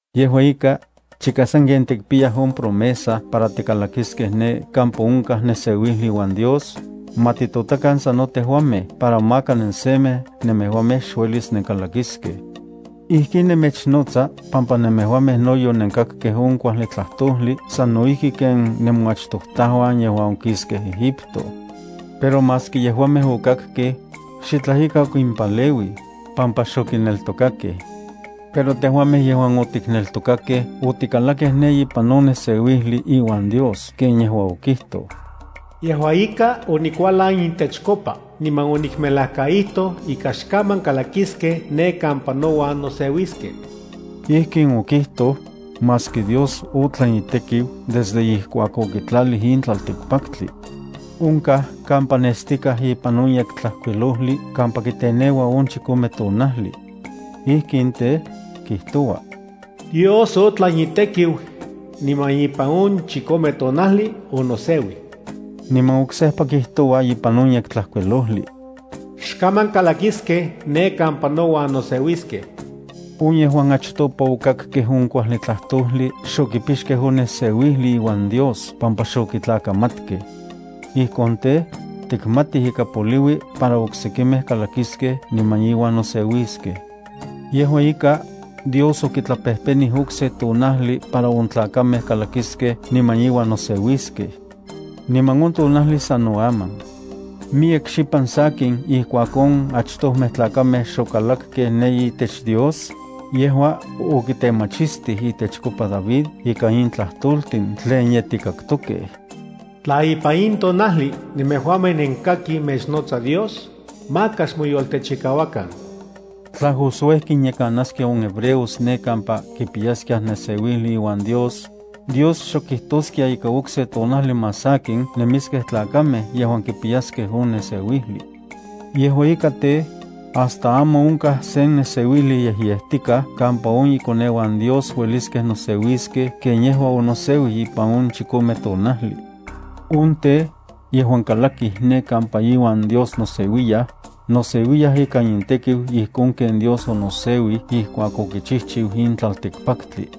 Yejua ika, chika sanken tikpiyaj on promesa para tikalakiskej ne kampa onkaj neseuijli iuan Dios, ma titotakan sano tejuamej para maka nensemej nemejuamej xuelis nenkalakiskej. Ijkin nemechnotsa pampa nemejuamej no yonenkakkej on kuajli tlajtojli sano ijki ken nemoachtojtajuan yejuan okiskej Egipto. Pero maski yejuamej okakkej, xitlaj ika okimpaleuij, pampa xokineltokakej. Pero tejuamej yejuan otikneltokakej otikalakej ne ipan on neseuijli iuan Dios ken yejua okijtoj: Yejua ika, onikualan intechkopa niman onikmelajkaijtoj ika xkaman kalakiskej ne kampa nouan noseuiskej. Ijkin okijtoj, maski Dios otlan itekiu desde ijkuak okitlalij in tlaltikpaktli. Onkaj kampa nestikaj ipan on Yektlajkuilojli kampa kiteneua on chikome tonajli. Ijkin tej, kijtoua: Dios otlan itekiu, niman ipan on chikome tonajli onoseuij. Niman oksejpa kijtoua ipan on Yektlajkuilojli: Xkaman kalakiskej ne kampa nouan noseuiskej. On yejuan achtopa okakkej on kuajli tlajtojli xokipixkej on neseuijli iuan Dios pampa xokitlakamatkej. Ijkon tej, tikmatij ika poliui para oksekimej kalakiskej niman iuan noseuiskej. Yejua ika, Dios okitlapejpenij okse tonajli para on tlakamej kalakiskej niman iuan noseuiskej. Niman on tonajli sano aman. Miyek xipan sakin ijkuak on achtojmej tlakamej xokalakkej ne itech Dios, yejua okitemachistij itechkopa David ikan in tlajtoltin tlen ye tikaktokej: Tla ipan in tonajli nemejuamej nenkakij mechnotsa Dios, maka xmoyoltechikauakan. Tla Josué kinyekanaskia on hebreos ne kampa kipiyaskiaj neseuijli iuan Dios, Dios xok kijtoskia ika okse tonajli más sakin nemiskej tlakamej yejuan kipiyaskej on neseuijli. Yejua ika tej, hasta aman onkaj sen neseuijli yejyejtikaj kampa on ikoneuan Dios ueliskej noseuiskej ken yejua onoseuij ipan on chikome tonajli. On tej, yejuan kalakij ne kampa iuan Dios noseuiyaj, noseuiyaj ikan intekiu ijkon ken Dios onoseuij ijkuak okichijchiu in tlaltikpaktli.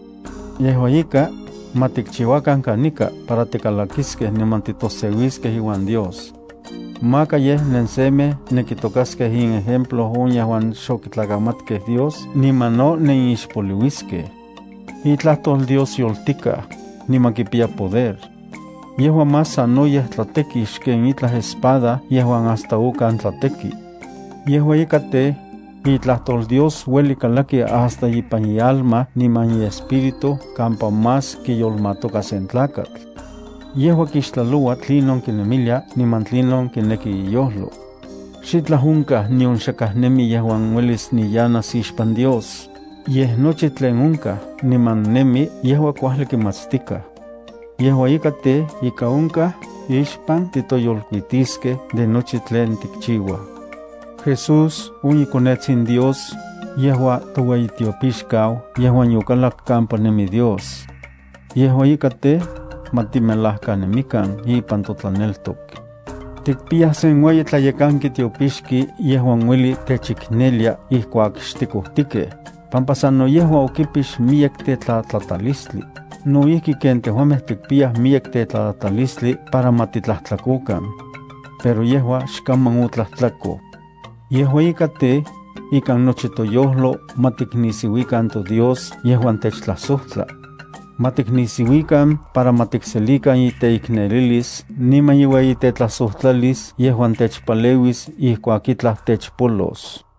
Yejua ika, ma tikchiuakan kanika para tikalakiskej niman titoseuiskej iuan Dios. Maka yej nensemej nenkitokaskej inejemplo on yejuan xokitlakamatkej Dios niman no nenixpoliuiskej. Itlajtol Dios yoltikaj, niman kipiya poder. Yejua más sanoyej tlateki xken itlaj espada yejuan hasta okan tlateki. Yejua ika tej, itlajtol Dios ueli kalaki hasta ipan ialma niman iespíritu kampa más kiyolmatoka sen tlakatl. Yejua kixtlaloua tlinon kinemilia niman tlinon kineki iyojlo. Xitlaj onkaj nion xakaj nemi yejuan uelis niyanas ixpan Dios, yej nochi tlen onkaj niman nemi yejua kuajli kimatstikaj. Yejua ika tej, ika onkaj ixpan titoyolkuitiskej de nochi tlen tikchiuaj. Jesús, on iKonetsin Dios, yejua toueyitiopixkau yejuan yokalak kampa nemi Dios. Yejua ika tej, ma timelajkanemikan ipan totlaneltok. Tikpiyaj sen ueyi tlayekanki tiopixki yejuan ueli techiknelia ijkuak xtikojtikej, pampa sano yejua okipix miyek tetlatlatalistli no ijki ken tejuamej tikpiyaj miyek tetlatlatalistli para ma titlajtlakokan. Pero yejua xkaman otlajtlakoj. Yejua ika tej, ikan nochi toyojlo ma tiknisiuikan toDios yejuan techtlajsojtla. Ma tiknisiuikan para ma tikselikan iteiknelilis niman iueyi tetlajsojtlalis yejuan techpaleuis ijkuak itlaj techpolos.